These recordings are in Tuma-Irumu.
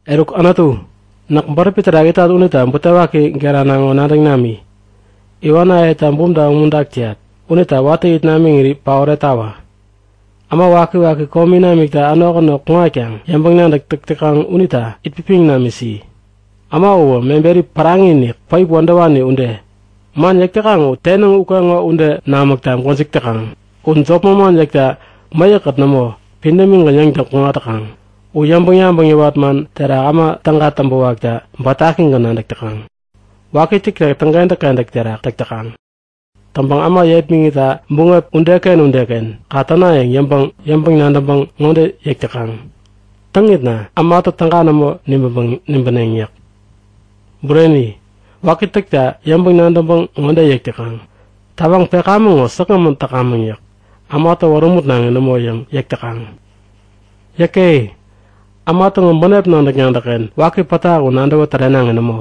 Eruk Anutu, näk bäräpi terak itat unita butewaki gerana ŋo nadäŋ nami! Iwanayeta bumta umuntak täyat unita watä it namiŋiri paoretawä. Äma wakiwaki komi namikta änok änok kuŋatkaŋ yäŋpäŋ-nadäk täk täkaŋ unita itpipiŋ namisi. Äma uwä meberi päraŋi-inik, päip wädäwani ude. Man yäk täkaŋ u tenäŋ ukeŋo ude namäkta gwäjik täkaŋ. U jop manman yäkta mäyäkkät nämo pidämigän yäŋtäŋ kuŋat täkaŋ. U yäŋpäŋ-yabäŋ yäwat man terak äma täga täŋpäwakta bätakigän nadäk täkaŋ. Waki täkta täŋkentäk-kentäk terak täk täkaŋ. Täŋpäŋ äma yepmäŋitta buŋep udeken udeken kaŋ täna yäŋ yäŋpäŋ-nadäŋpäŋ ŋode yäk täkaŋ; Täŋitna ämatä täga nämo nibäneŋ yäk. Bureni, waki täkta yäŋpäŋ-nadäŋpäŋ ŋode yäk täkaŋ; Tawaŋ pekamäŋ ŋo säkgämän täkamäŋ yäk. Ämatä wärämutnaŋi nämo yäŋ yäk täkaŋ. Yäke! Äma täŋo bänep nadäk-nadäkken waki pätak u nadäwä tärenaŋi nämo!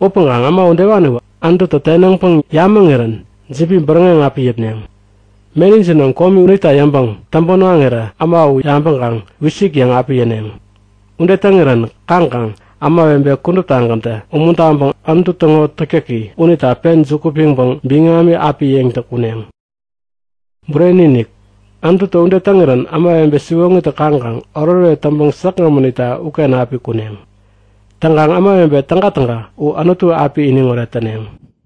Upäŋkaŋ äma udewaniwä Anututä tenäŋpäŋ yamäŋirän jibi bäräŋeŋ api yäpneŋ. Meni jinom komi unita yäŋpäŋ täŋpän waŋirä äma u yabäŋkaŋ wisik yäŋ api yäneŋ. Ude täŋirän kaŋkaŋ ämawebe kuduptagäntä umuntaŋpäŋ Anutu täŋo täktäki unita pen juku piŋpäŋ biŋami api yäŋtäŋ kuneŋ. Bureni-inik, Anututä ude täŋirän ämawebe siwoŋitä kaŋkaŋ oretoret täŋpeŋ säkgämän itta uken api kuneŋ. Täŋkaŋ ämawebe tägatäga u Anutu api iniŋoret täneŋ!